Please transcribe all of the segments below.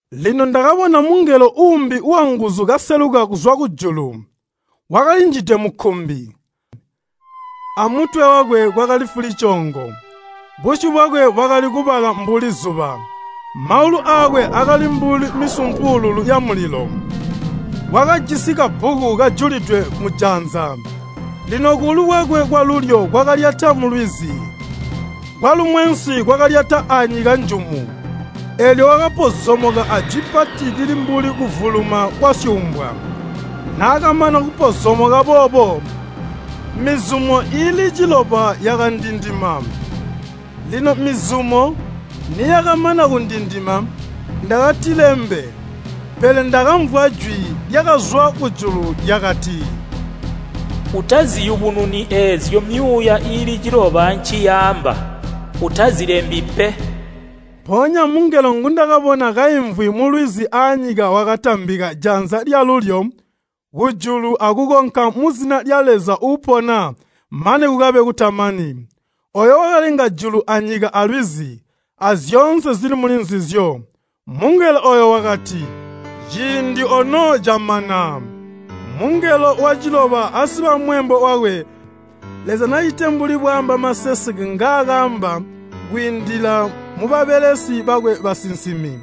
Lino ndakabona mungelo uumbi wanguzu kaseluka kuzwa kujulu. Wakalinjide mukkumbi, amutwe wakwe kwakali fulicoongo. Busyu bwakwe bwakali kubala mbuli zuba, maulu aakwe akali mbuli misumpuululu yamulilo. Wakajisi kabbuku kajulidwe mujanza. Lino kuulu kwakwe kwalulyo kwakalyata mulwizi, kwalumwensi kwakalyata anyika njumu. Eelyo wakapozomoka ajwi pati lili mbuli kuvuluma kwasyuumbwa. Naakamana kupozomoka boobo, mizumo iili ciloba yakandindima. Lino mizumo niyakamana kundindima, ndakatilembe. Pele ndakamvwa jwi lyakazwa kujulu lyakati, “Utaziyubununi eezyo myuuya iili ciloba nciyaamba. Utazilembi pe!” Mpoonya mungelo ngundakabona kaimvwi mulwizi aanyika wakatambika janza lyalulyo kujulu akukonka muzina lya Leza uupona mane kukabe kutamani, ooyo wakalenga julu anyika alwizi, azyoonse zili muli nzizyo. Mungelo ooyo wakati, “Ciindi ono camana! Mungelo waciloba asiba mweembo wakwe, Leza nacite mbuli bwaamba maseseke ngaakaamba kwiindila mubabelesi bakwe basinsimi.”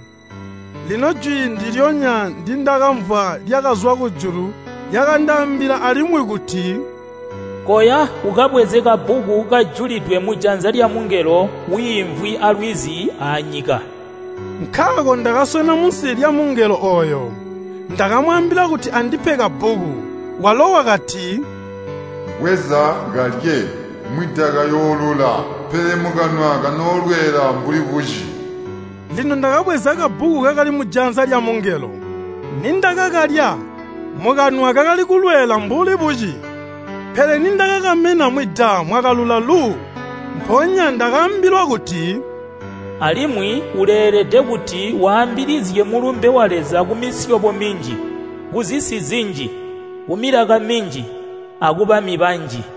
Lino jwi ndilyonya ndindakamvwa lyakazwa kujulu lyakandaambila alimwi kuti, “Koya ukabweze kabbuku kajulidwe mujanza lyamungelo wiimvwi alwizi aanyika.” Nkaako ndakaswena munsi lyamungelo ooyo, ndakamwaambila kuti andipe kabbuku. Walo wakati, “Bweza, kalye, mwida kayoolula, pele mukanwa kanoolweela mbuli buci.” Lino ndakabweza kabbuku kakali mujanza lyamungelo. Nindakakalya, mukanwa kakali kulweela mbuli buci, pele nindakakamena mwida mwakalula lu. Mpoonya ndakaambilwa kuti, “Alimwi uleelede kuti waambilizye mulumbe wa Leza kumisyobo minji, kuzisi zinji, kumilaka minji, akubami banji.”